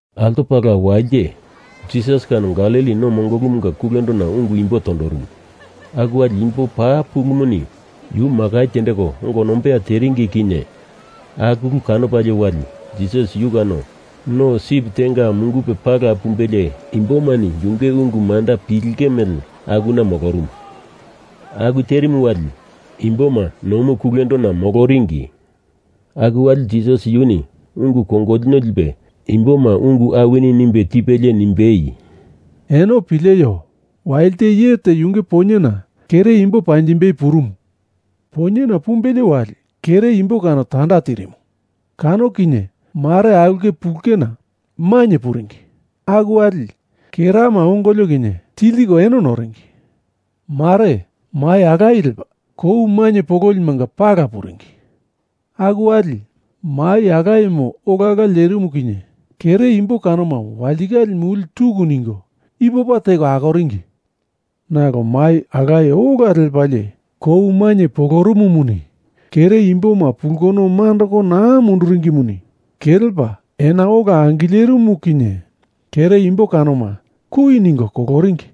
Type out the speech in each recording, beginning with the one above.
Altopala walite Jisas kano Galili no mongolumu kulendona ungu imbo tondorumu. Aku wali imbo paa pulumuni yu makai tendeko ongo nombeya teringi kinye aku ulu kanopalie wali Jisas yu kano no sip tenga mungupe pala pumbelie imbomani yunge ungu manda pilinge mele akuna molorumu. Aku terimu wali imboma nomu kulendona moloringi. Aku wali Jisas yuni ungu kongolino lipelie imboma ungu awini nimbe tipelie nimbei, “Eno pileio! Walite iye te yunge poinyena kere imbo panjimbei purumu. Poinyena pumbelie wali kere imbo kano tanda tirimu. Kano kinye mare aulke pulena mainye puringi. Aku wali kerama ongolio kinye tiltiko eno noringi. Mare mai alaye lepa kou mainye pololimanga pala puringi. Aku wali mai alayemu olala lerimu kinye kere imbo kanoma walitikale muli tuku ningo ipopa teko akoringi. Nalo mai alaye ola lepalie kou mainye polorumumuni kere imboma pulkono mandoko naa munduringimuni kelepa ena ola angilerimu kinye kere imbo kanoma kui ningo koloringi.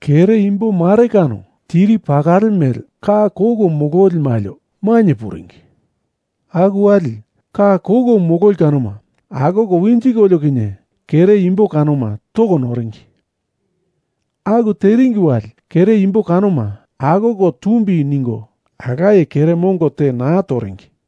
Kere imbo mare kano tiri pakale mele ka koko mololi malio mainye puringi. Aku wali, ka koko mololi kanoma akoko winjikolio kinye kere imbo kanoma toko noringi. Aku teringi wali kere imbo kanoma akoko tumbi ningo alaye kere mongo te naa toringi.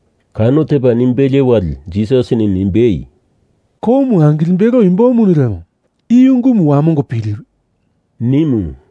Kano tepa nimbelie wali Jisasini nimbei, “Komu angilimbelo imbomuni lemo i ungumu wamongo piliwi,” nimu.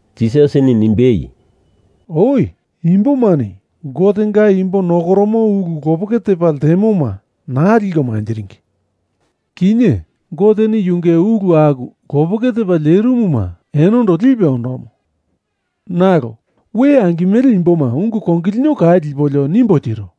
Jisasini nimbei, “Oi imbomani Gotenga imbo nokoromo ulu lopeke tepa ltemoma naa liko manjiringi. Kinye Goteni yunge ulu aku lopeke tepa lerimuma enondo lipe ondomo. Nalo we angimele imboma ungu kongolino kau lipolio nimbo tiro.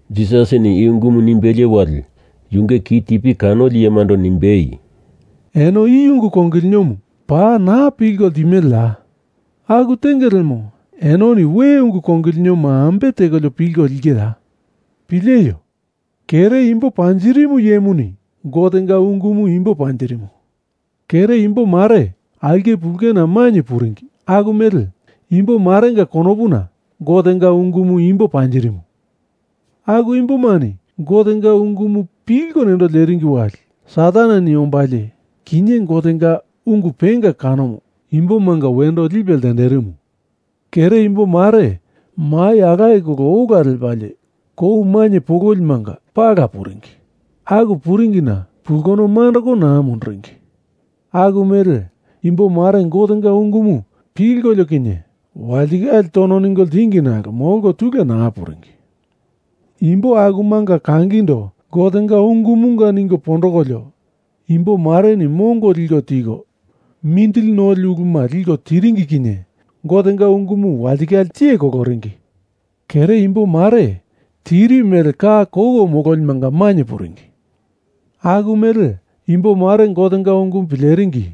Jisasini i ungumu nimbelie wali yunge ki tipi kanoli iyemando nimbei, “Eno i ungu kongolinomu paa naa pilko ltimeleya? Aku tenge lemo, enoni we ungu kongolinoma ambe tekolio pilko lingeya? Pileio! Kere imbo panjirimu iyemuni Gotenga ungumu imbo panjirimu. Kere imbo mare aulke pulena mainye puringi aku mele imbo marenga konopuna Gotenga ungumu imbo panjirimu. Aku imbomani Gotenga ungumu pilko nendo leringi wali Sataneni ombalie kinye Gotenga ungu penga kanomu imbomanga wendo lipe ltenderimu. Kere imbomare mai alaye kolo ola lepalie kou mainye pololimanga pala puringi. Aku puringina pulkono mandoko naa munduringi. Aku mele imbo mare Gotenga ungumu pilkolio kinye walitikale tono ningo ltingi nalo molko tule naa puringi. Imbo akumanga kangindo Gotenga ungumunga ningo pondokolio imbomareni mongo liko tiko mindili noli uluma liko tiringi kinye Gotenga ungumu walitikale tiye koloringi. Kere imbo mare tiri mele ka koko mololimanga mainye puringi aku mele imbomare Gotenga ungumu pileringi.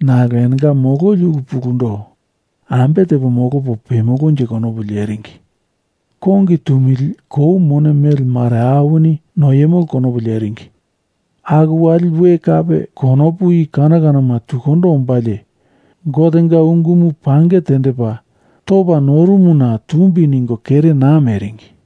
Nalo enonga mololi ulu pulundo ambe tepo molopo pemolonje konopu leringi, kongi tumili kou mone mele mare awini noiemolo konopu leringi, aku wali we kape konopu i kano kanoma tukundo ombalie Gotenga ungumu pange tendepa topa norumuna tumbi ningo kere naa meringi.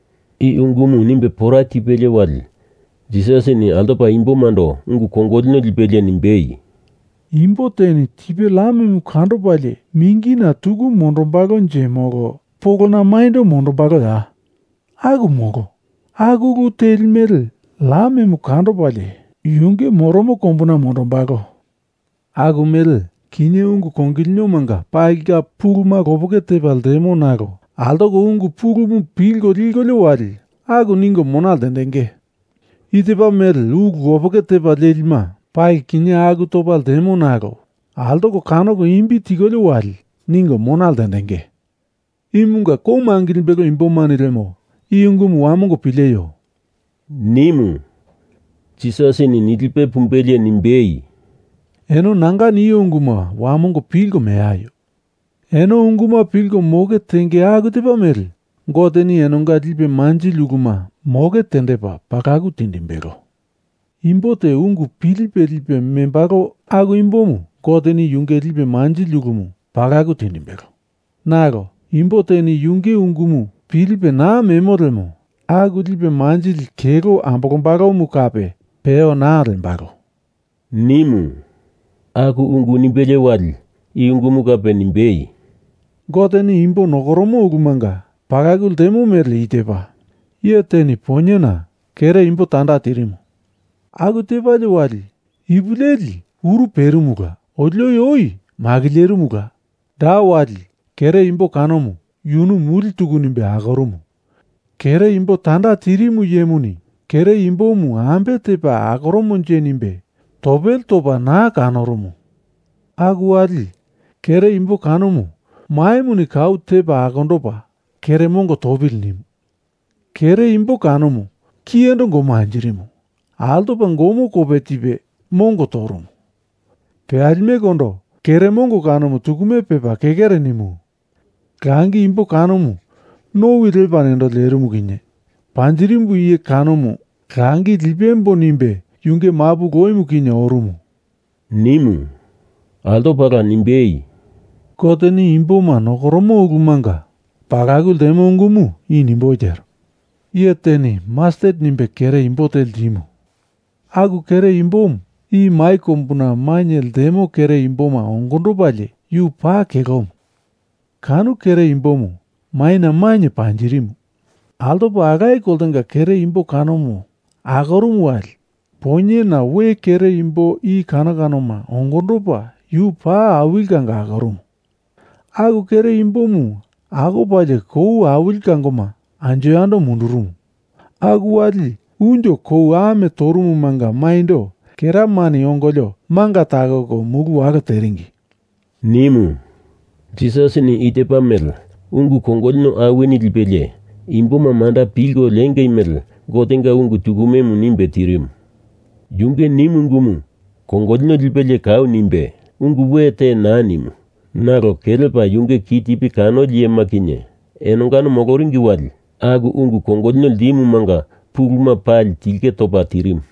I ungumu nimbe pora tipelie wali Jisasini altopala imbomando ungu kongolino lipelie nimbei, “Imbo teni tipe lamemu kandopalie mingina tuku mondombalonje molo polona maindo mondombaloya? Aku molo. Aku ulu teli mele lamemu kandopalie yunge moromo kombuna mondombalo. Aku mele kinye ungu kongolinomanga palinga puluma lopeke tepa ltemo nalo altoko ungu pulumu pilko likolio wali aku ningo mona ltendenge. I tepa mele ulu lopeke telima pali kinye aku topa ltemo nalo altoko kanoko imbi tikolio wali ningo mona ltendenge. Imunga komu angilimbelo imbomani lemo i ungumu wamongo pileio!” nimu. Jisasini nilipe pumbelie nimbei, “Eno nanga nio unguma wamongo pilko meaio! Eno unguma pilko moke tenge aku tepa mele Goteni enonga lipe manjili uluma moke tendepa pakalu tindimbelo. Imbo te ungu pilipe lipe membalo aku imbomu Goteni yunge lipe manjilimu palaku tindimbelo. Nalo imbo teni yunge ungumu pilipe naa memo lemo, aku lipe manjili kelo ambolombalomu kape peyo naa lembalo,” nimu. Aku ungu nimbelie wali i ungumu kape nimbei, “Goteni imbo nokoromo ulumunga palaku ltemo mele i tepa. Iye teni poinyena kere imbo tanda tirimu. Aku tepalie wali, ipu leli uru perimula otili oi makilerimula, da wali kere imbo kanomu yunu muli tuku nimbe akorumu. Kere imbo tanda tirimu iyemuni kere imbomu ambe tepa akoromonje nimbe topele topa naa kandorumu. Aku wali, kere imbo kanomu maimuni kau tepa akondopa kere mongo topili nimu. Kere imbo kanomu kiyendo gomo anjirimu. Altopa gomo kope tipe mongo torumu. Peyalimekondo kere mongo kanomu tukume pepa kekere nimu. Langi imbo kanomu nowi lepa nendo lerimu kinye panjirimu iye kanomu langi lipemboi nimbe yunge mapu loimu kinye orumu,” nimu. Altopala nimbei, “Goteni imboma nokoromo ulumunga palaku ltemo ungumu i nimboi tero. Iye teni mastet nimbe kere imbo te ltimu. Aku kere imbomu i mai kombuna mainye ltemo kere imboma ongondopalie yu paa kelomu, kano kere imbomu maina mainye panjirimu. Altopa alaye koltenga kere imbo kanomu akorumu wali poinyena we kere imbo i kano kanoma ongondopa yu paa awili kango akorumu. Aku kere imbomu akopalie kou awili kangoma anjo yando mundurumu. Aku wali unjo kou amo torumumanga maindo keramani ongolio manga takoko mulu walo teringi,” nimu. Jisasini i tepa mele ungu kongolino awini lipelie imboma manda pilko lengei mele Gotenga ungu tukumemu nimbe tirimu. Yunge nimu ungumu kongolino lipelie kau nimbe, ungu we te naa nimu nalo kelepa yunge kitipi kanoli iyema kinye enongano moloringi wali aku ungu kongolino ltimumanga puluma pali tilke topa tirimu.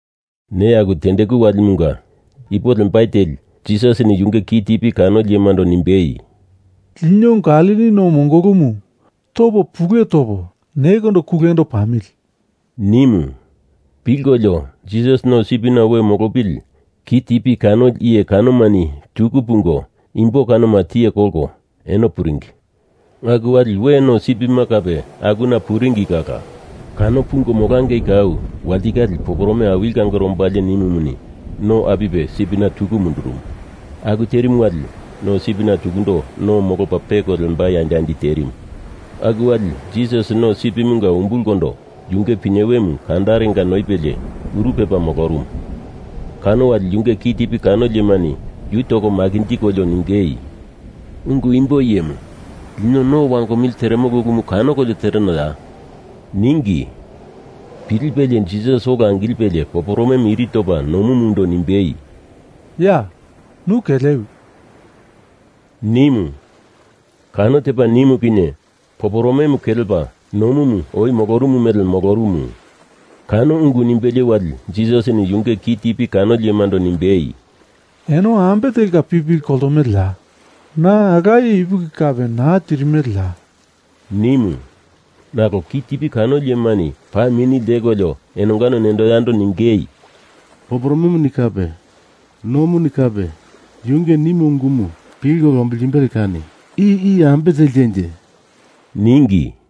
Neya aku tendeku walimunga ipo lembai teli, Jisasini yunge kitipi kanoli iyemando nimbei, “Lino Galili no mongolumu topo pule topo nekondo kulendo pamili,” nimu. Pilkolio, Jisas no sipina we molopili kitipi kanoli iye kanomani tuku pungo, imbo kanoma tiye kolko eno puringi. Aku wali we no sipima kape akuna puringi kala. Kano pungo molangei kau, walitikale poporome awili kangore ombalie nimumuni no apipe sipina tuku mundurumu. Aku terimu wali no sipina tukundo no molopa peko lembai andi andi terimu. Aku wali Jisas no sipimunga umbulkondo yunge pinyewemu kandarenga noipelie uru pepa molorumu. Kano wali yunge kitipi kanoli iyemani yu toko makinjikolio ningei, “Ungu imbo iyemu, lino no wangomili teremolo ulumu kanokolio terenoya?” ningi. Pilipelie Jisas ola angilipe poporome iri topa nomundo nimbei, “Ya! Nu kelewi!” nimu. Kano tepa nimu kinye poporome kelepa nomu oi molorumu mele molorumu. Kano ungu nimbelie wali Jisasini yunge kitipi kanoli iyemando nimbei, “Eno ambe telka pipili koltomeleya? Na alaye ipuki kape naa tirimeleya?” nimu. Nalo kitipi kanoli iyemani paa mini ltekolio enonga nendo yando ningei, “Poporomemuni kape nomuni kape yunge nimo ungumu pilko lombiltimbele kani i iye ambe teltenje?” ningi.